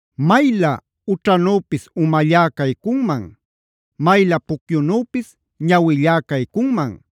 Maylä ućhanüpis umallá caycunman; maylä pucyunüpis ñawillá caycunman.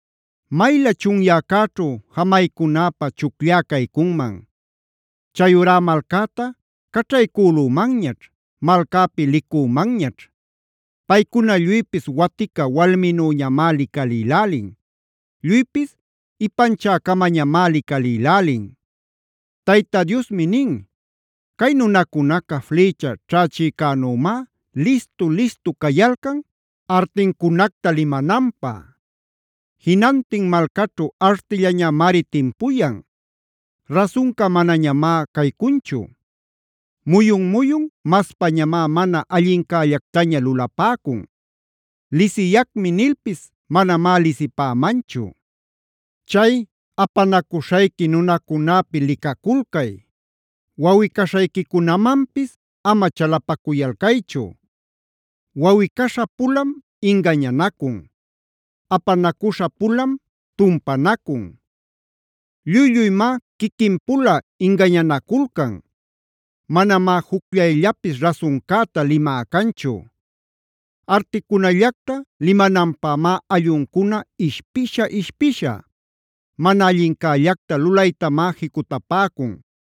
Maylä chunyäcäćhu jamaycunäpä chucllá caycunman. Chayurá malcäta caćhaycülümanñaćh, malcäpi licümanñaćh. Paycuna lluypis watica walminüñamá licalïlälin; lluypis ipanchä-camañamá licalïlälin. Tayta Diosmi nin: “Cay nunacunaca flïcha ćhächïcänümá listu-listu cayalcan artincunacta limananpä. Jinantin malcaćhu artillañamari timpuyan; rasunca manañamá caycunchu. Muyun-muyun maspañamá mana allincällactaña lulapäcun. ‘Lisiyacmi’ nilpis manamá lisipämanchu. “Chay apanacuśhayqui nunacunäpi licaculcay. Wawꞌi-caśhayquicunamanpis ama chalapacuyalcaychu. Wawꞌi-caśha-pulam ingañanacun; apanacuśha-pulam tumpanacun. Lluy-lluymá quiquin-pula ingañanaculcan; manamá jucllayllapis rasuncäta limä canchu. Articunallacta limananpämá alluncuna ishpisha-ishpisha; mana allincällacta lulaytamá jicutapäcun.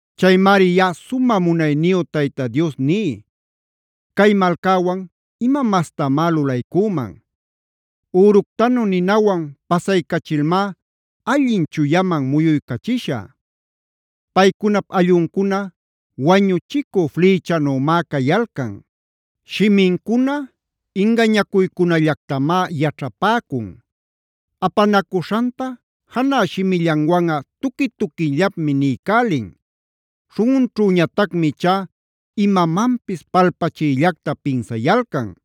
“Chaymari yaꞌa sumä munayniyu Tayta Dios ní: Cay malcäwan ¿ima mastamá lulaycüman? Üructanu ninawan pasaycachilmá allin chuyaman muyuycachishä. Paycunap alluncuna wañuchicü flïchanümá cayalcan; shimincuna ingañacuycunallactamá yaćhapäcun. Apanacuśhanta janä shimillanwanꞌa tuqui-tuquillapmi niycälin; śhunꞌunćhüñatacmi ichá imamanpis palpachiyllacta pinsayalcan.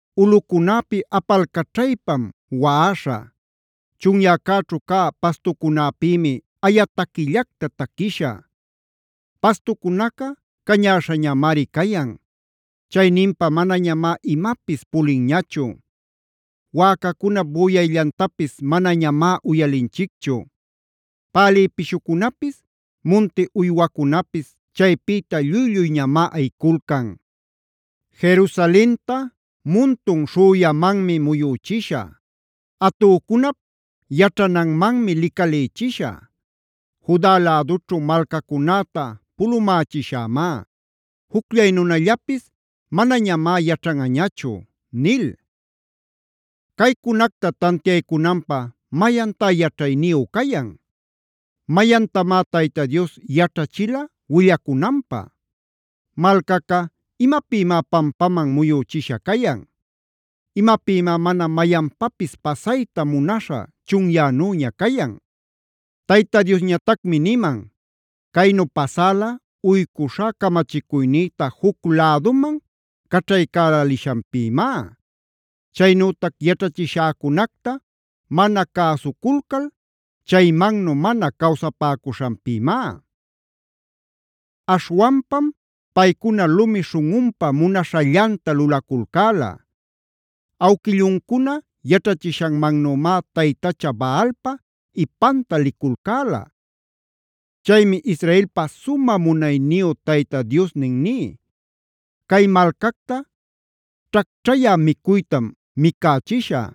“Ulꞌucunäpi apalcaćhaypam waꞌaśhä; chunyäcäćhu cä pastucunäpïmi aya taquillacta taquishä. Pastucunaca cañäśhañamari cayan; chayninpa manañamá imapis pulinñachu. Wäcacunap büyayllantapis manañamá uyalinchicchu; Pälï pishucunapis munti uywacunapis chaypïta lluy-lluyñamá ayiculcan. “Jerusalenta muntun śhüyamanmi muyüchishä; atücunap yaćhananmanmi licalïchishä. Juda lädućhu malcacunäta pulumächishämá; jucllay nunallapis manañamá yaćhanꞌañachu” nil. Caycunacta tantiaycunanpä, ¿mayantá yaćhayniyu cayan? ¿Mayantamá Tayta Dios yaćhachila willacunanpä? Malcaca, ¿imapïmá pampaman muyüchisha cayan? ¿Imapïmá mana mayanpapis pasayta munaśha chunyänüña cayan? Tayta Diosñatacmi niman: “Caynu pasäla, uycuśhá camachicuynïta juc läduman caćhaycälälishanpïmá; chaynütac yaćhachishäcunacta mana cäsuculcal chaymannu mana cawsapäcuśhanpïmá. Aśhwanpam paycuna lumi śhunꞌunpa munaśhallanta lulaculcäla. Awquilluncuna yaćhachishannümá taytacha Baalpa ipanta liculcäla. Chaymi Israelpa sumä munayniyu Tayta Diosnin ní: Cay malcacta ćhacćhayä micuytam micächiśhä;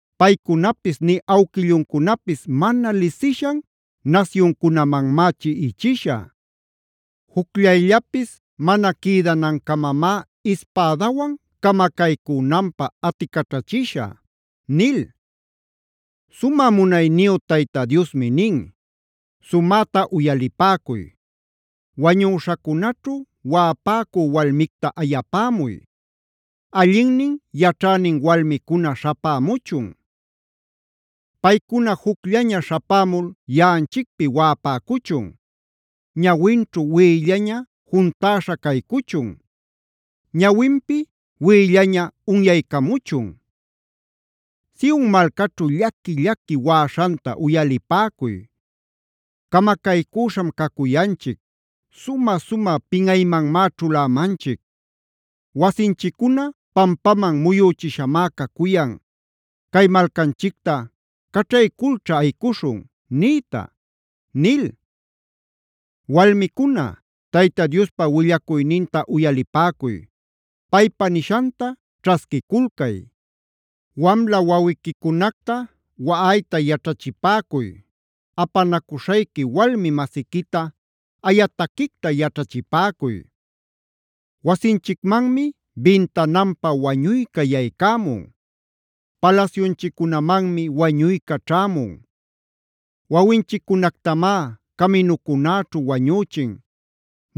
Paycunapis nï awquilluncunapis mana lisishan nasyuncunamanmá chiꞌichishä. Jucllayllapis mana quïdanancamamá ispädawan camacaycünanpä aticaćhachishä” nil. Sumä munayniyu Tayta Diosmi nin: “¡Sumäta uyalipäcuy! Wañüśhacunaćhu waꞌapäcü walmicta ayapämuy; allinnin yaćhänin walmicuna śhapämuchun. Paycuna jucllaña śhapämul yaꞌanchicpi waꞌapäcuchun. Ñawinćhu wiꞌillaña juntäśha caycuchun; ñawinpi wiꞌillaña unyaycamuchun. Sion malcaćhu llaqui-llaqui waꞌaśhanta uyalipäcuy: ‘Camacaycüśham cacuyanchic; sumä-sumä pinꞌaymanmá ćhulämanchic. Wasinchiccuna pampaman muyüchishamá cacuyan; cay malcanchicta caćhayculćha ayicuśhun’ nïta” nil. Walmicuna, Tayta Diospa willacuyninta uyalipäcuy; paypa nishanta ćhasquiculcay. Wamla wawiquicunacta waꞌayta yaćhachipäcuy; apanacuśhayqui walmi-masiquita aya taquicta yaćhachipäcuy. Wasinchicmanmi bintananpa wañuyca yaycämun; palasyunchiccunamanmi wañuyca ćhämun. Wawinchiccunactamá caminucunäćhu wañüchin;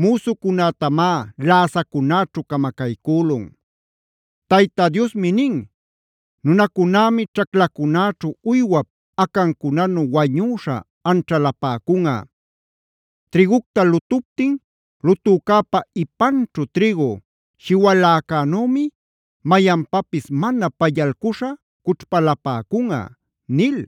müsucunätamá läsacunäćhu camacaycülun. Tayta Diosmi nin: “Nunacunämi ćhaclacunäćhu uywap acancunanu wañüśha anćhalapäcunꞌa. Trïgucta lutuptin, lutücäpa ipanćhu trïgu shiwaläcänümi mayanpapis mana pallalcuśha cućhpalapäcunꞌa” nil.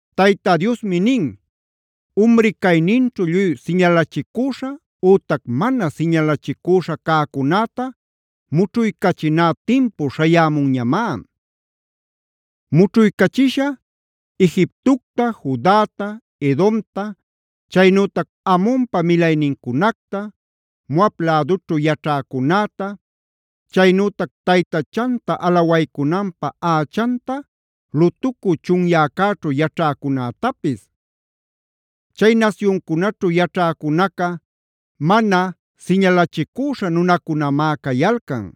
Tayta Diosmi nin: “Umri cayninćhu lluy siñalachicüśha ütac mana siñalachicüśha cäcunäta mućhuycachiná timpu śhayämunñamá. Mućhuycachishä Egiptocta, Judata, Edomta, chaynütac Amonpa milaynincunacta, Moab lädućhu yaćhäcunäta, chaynütac taytachanta alawaycunanpä ächanta lutucü chunyäcäćhu yaćhäcunätapis. Chay nasyuncunaćhu yaćhäcunaca mana siñalachicüśha nunacunamá cayalcan;